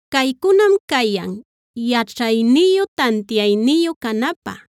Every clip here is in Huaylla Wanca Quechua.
Caycunam cayan, yaćhayniyu, tantiayniyu canapä,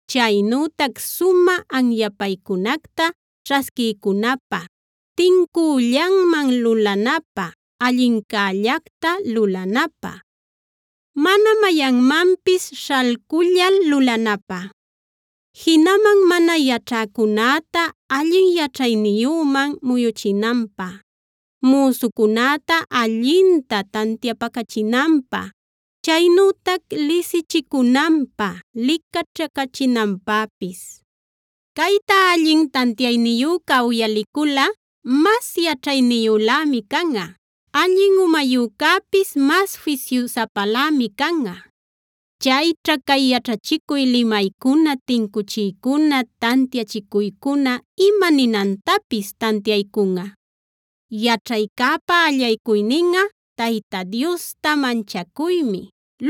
chaynütac sumä anyapaycunacta ćhasquiycunapä, tincüllanman lulanapä, allincällacta lulanapä, mana mayanmanpis śhalcullal lulanapä, jinaman mana yaćhäcunäta allin yaćhayniyüman muyuchinanpä, müsucunäta allinta tantiapacachinanpä, chaynütac lisichicunanpä licaćhacachinanpäpis. Cayta allin tantiayniyüca uyaliculꞌa mas yaćhayniyülämi canꞌa; allin umayücäpis mas fisyusapalämi canꞌa. Chayćha cay yaćhachicuy limaycuna, tincuchiycuna, tantiachicuycuna ima ninantapis tantiaycunꞌa. Yaćhaycäpa allaycuyninꞌa Tayta Diosta manchacuymi;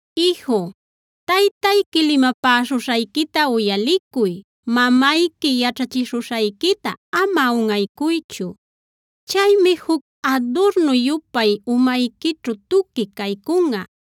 Iju, taytayqui limapäśhuśhayquita uyalicuy; mamayqui yaćhachishuśhayquita ama unꞌaycuychu. Chaymi juc adurnu-yupay umayquićhu tuqui caycunꞌa;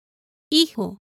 Iju,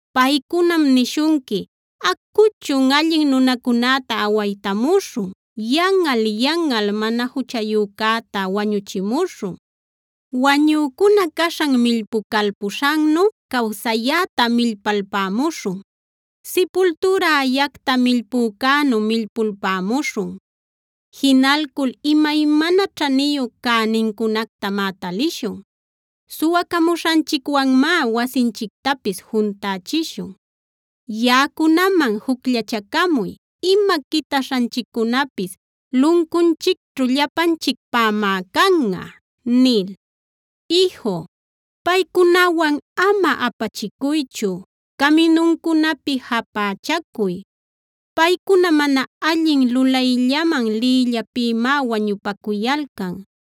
Paycunam nishunqui: “Acuchun, allin nunacunäta awaytamuśhun; yanꞌal-yanꞌal mana juchayücäta wañüchimuśhun. Wañücuna caśhan millpucalpuśhannu cawsayäta millpalpämuśhun; sipultüra ayacta millpücänu millpulpämuśhun. Jinalcul imaymana ćhaniyu cänincunactamá talishun; suwacamuśhanchicwanmá wasinchictapis juntächishun. Yaꞌacunaman jucllachacamuy, ima quitaśhanchiccunapis luncunchicćhu llapanchicpämá canꞌa” nil. Iju, paycunawan ama apachicuychu; caminuncunapi japächacuy. Paycuna mana allin lulayllaman liyllapïmá wañupacuyalcan;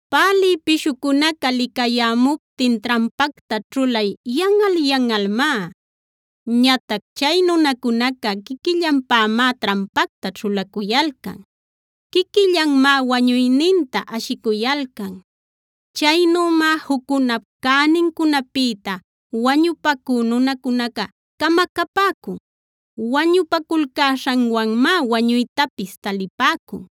Pälï pishucunaca licayämuptin trampacta ćhulay yanꞌal-yanꞌalmá. Ñatac chay nunacunaca quiquillanpämá trampacta ćhulacuyalcan; quiquillanmá wañuyninta ashicuyalcan. Chaynümá juccunap cänincunapïta wañupacü nunacunaca camacapäcun; wañupaculcäśhanwanmá wañuytapis talipäcun.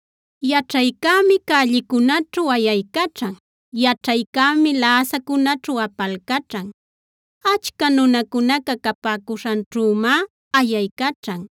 Yaćhaycämi cällicunäćhu ayaycaćhan; yaćhaycämi läsacunäćhu apalcaćhan. Achca nunacunaca capäcuśhanćhümá ayaycaćhan;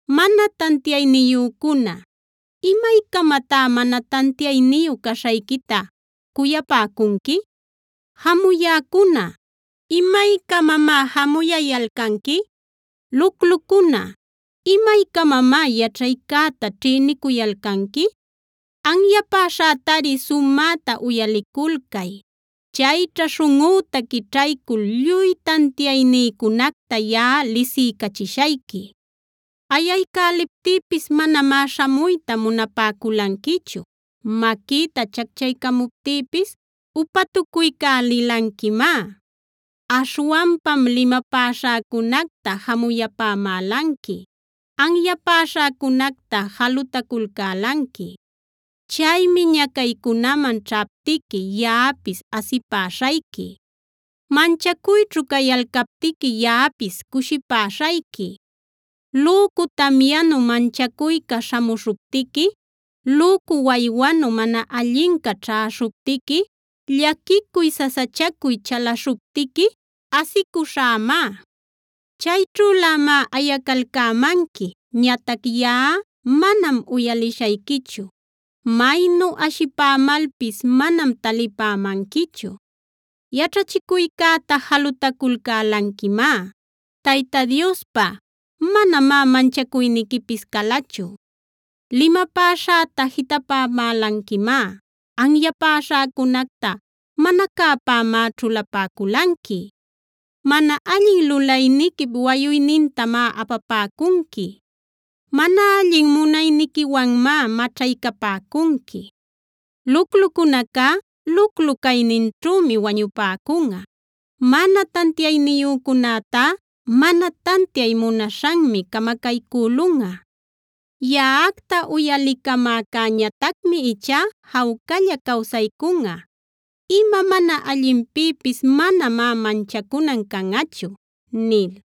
“Mana tantiayniyücuna, ¿imaycamatá mana tantiayniyu caśhayquita cuyapäcunqui? Jamuyäcuna, ¿imaycamamá jamuyayalcanqui? Luclucuna, ¿imaycamamá yaćhaycäta ćhïnicuyalcanqui? Anyapäśhätari sumäta uyaliculcay. Chayćha śhunꞌüta quićhaycul lluy tantiaynïcunacta yaꞌa lisiycachishayqui. “Ayaycäliptïpis manamá śhamuyta munapäculanquichu; maquïta chacchaycamuptïpis upatucuycälilanquimá. Aśhwanpam limapäśhäcunacta jamuyapämälanqui; anyapäśhäcunacta jalutaculcälanqui. Chaymi ñacaycunaman ćhaptiqui yaꞌapis asipäśhayqui; manchacuyćhu cayalcaptiqui yaꞌapis cushipäśhayqui. Lücu tamyanu manchacuyca śhamuśhuptiqui, lücu waywanu mana allinca ćhäśhuptiqui, llaquicuy sasachacuy chalaśhuptiqui asicuśhämá. “Chayćhülämá ayacalcämanqui, ñatac yaꞌa manam uyalishayquichu; maynu ashipämalpis manam talipämanquichu. Yaćhachicuycäta jalutaculcälanquimá; Tayta Diospa manamá manchacuyniquipis calachu. Limapäśhäta jitapapämälanquimá; anyapäśhäcunacta mana cäpämá ćhulapäculanqui. Mana allin lulayniquip wayuynintamá apapäcunqui; mana allin munayniquiwanmá maćhaycapäcunqui. Luclucunacá luclu-cayninćhümi wañupäcunꞌa; mana tantiayniyücunätá mana tantiay munaśhanmi camacaycülunꞌa. Yaꞌacta uyalicamäcäñatacmi ichá jawcalla cawsaycunꞌa; ima mana allinpïpis manamá manchacunan canꞌachu” nil.